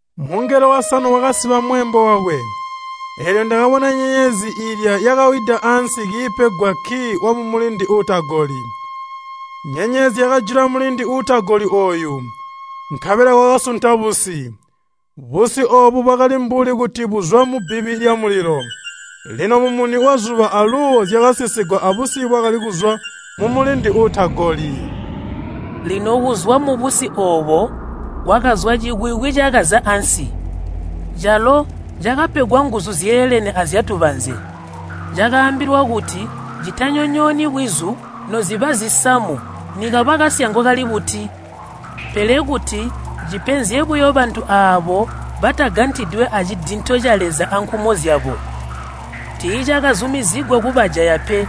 Mungelo wasanu wakasiba mweembo wakwe. Eelyo ndakabona nyenyezi iilya yakawida ansi kiipegwa kkii wamulindi uutagoli. Nyenyezi yakajula mulindi uutagoli ooyu, nkabela kwakasunta busi. Busi oobu bwakali mbuli kuti buzwa mubbibi lyamulilo. Lino mumuni wazuba aluuwo zyakasizigwa abusi bwakali kuzwa mumulindi uutagoli. Lino kuzwa mubusi oobo kwakazwa cikwikwi cakaza ansi. Calo cakapegwa nguzu zyeelene azyatubanze. Cakaambilwa kuti citanyonyooni bwizu noziba zisamu nikaba kasyango kali buti, pele kuti cipenzye buyo bantu aabo batagantidwe acidinto ca Leza ankumo zyabo. Tiicakazumizigwa kubajaya pe,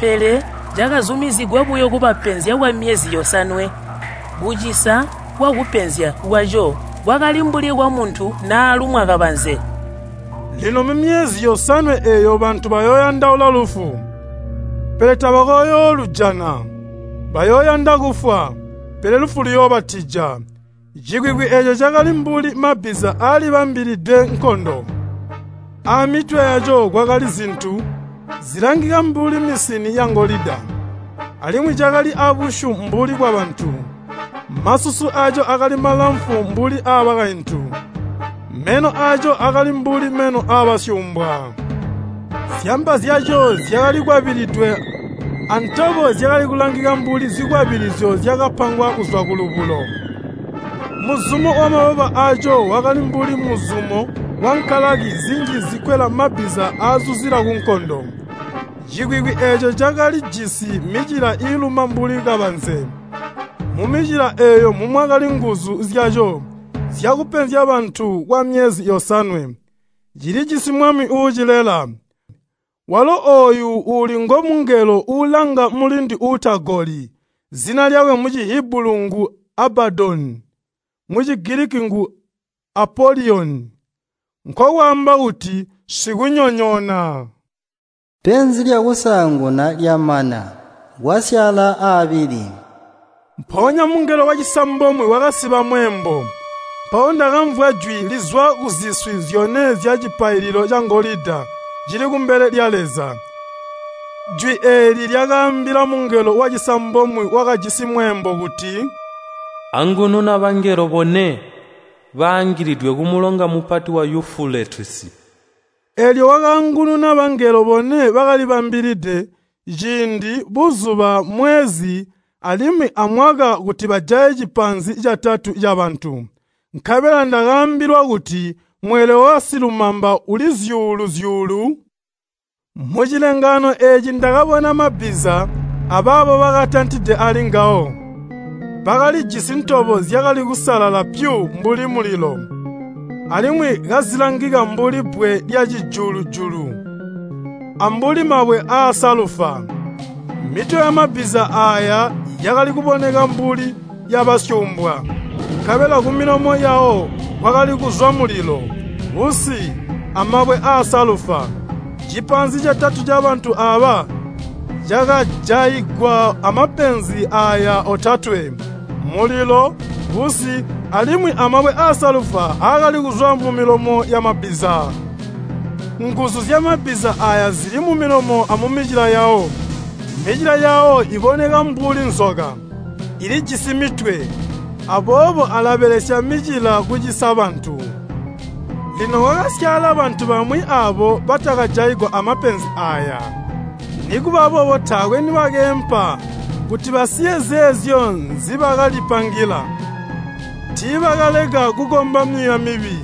pele cakazumizigwa buyo kubapenzya kwamyezi yosanwe. Kucisa kwakupenzya kwaco kwakali mbuli kwamuntu naalumwa kabanze. Lino mumyezi yosanwe eeyo bantu bayooyandaula lufu, pele tabakooyoolujana. Bayooyanda kufwa, pele lufu luyoobatija. Cikwikwi eeco cakali mbuli mabbiza aalibambililide nkondo. Aamitwe yaco kwakali zintu zilangika mbuli misini yangolida, alimwi cakali abusyu mbuli bwabantu. Masusu aaco akali malamfu mbuli aabakaintu. Meno aaco akali mbuli meno aabasyuumbwa. Zyamba zyaco zyakali kwabilidwe antobo zyakali kulangika mbuli zikwabilizyo zyakapangwa kuzwa kulubulo. Muzumo wamababa aaco wakali mbuli muzumo wankalaki zinji zikwelwa mabbiza aazuzila kunkondo. Cikwikwi eeco cakalijisi micila iiluma mbuli kabanze. Mumicila eeyo mumwakali nguzu zyaco zyakupenzya bantu kwamyezi yosanwe. Cilijisi mwami uucilela, walo ooyu uuli ngomungelo uulanga mulindi uutagoli. Zina lyakwe mu Cihibulu ngu Abbadoni, mu Cigiliki ngu Apoliyoni, (nkokwaamba kuti, “Sikunyonyoona”). Penzi lyakusaanguna lyamana, kwasyaala aabili. Mpoonya mungelo wacisambomwe wakasiba mweembo, mpawo ndakamvwa jwi lizwa kuziswi zyone zyacipaililo cangolida cili kumbele lya Leza. Jwi eeli lyakaambila mungelo wacisambomwe wakajisi mweembo kuti, “Angununa bangelo bone baangilidwe kumulonga mupati wa Yufuletisi!” Eelyo wakaangununa bangelo bone bakalibambilide, ciindi, buzuba, mwezi, alimwi amwaka kuti bajaye cipaanzi catatu cabantu. Nkabela ndakaambilwa kuti mweelwe wabasilumamba uli zyuulu-zyuulu. Mucilengaano eeci ndakabona mabbiza abaabo bakatantide ali ngawo. Bakalijisi ntobo zyakali kusalala pyu mbuli mulilo, alimwi kazilangika mbuli bbwe lyacijulu-julu, ambuli mabwe aasalufa. Mitwe yamabbiza aaya yakali kuboneka mbuli yabasyuumbwa, nkabela kumilomo yawo kwakali kuzwa mulilo, busi, amabwe aasalufa. Cipaanzi catatu cabantu aaba cakajaigwa amapenzi aaya otatwe, mulilo, busi, alimwi amabwe aasalufa aakali kuzwa mumilomo yamabbiza. Nguzu zyamabbiza aaya zili mumilomo amumicila yawo. Micila yawo iboneka mbuli nzoka, ilijisi mitwe, aboobo alabelesya micila kucisa bantu. Lino kwakasyaala bantu bamwi aabo batakajaigwa amapenzi aaya, nikuba boobo taakwe nibakeempa kuti basiye zeezyo nzibakalipangila. Tiibakaleka kukomba myuuya mibi,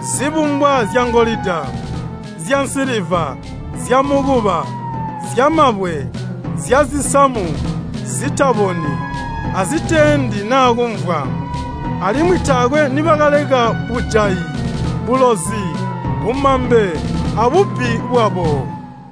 zibumbwa zyangolida, zyansiliva, zyamukuba, zyamabwe, zyazisamu, zitaboni, aziteendi naa kumvwa. Alimwi taakwe nibakaleka bujayi, bulozi, bumambe, abubbi bwabo.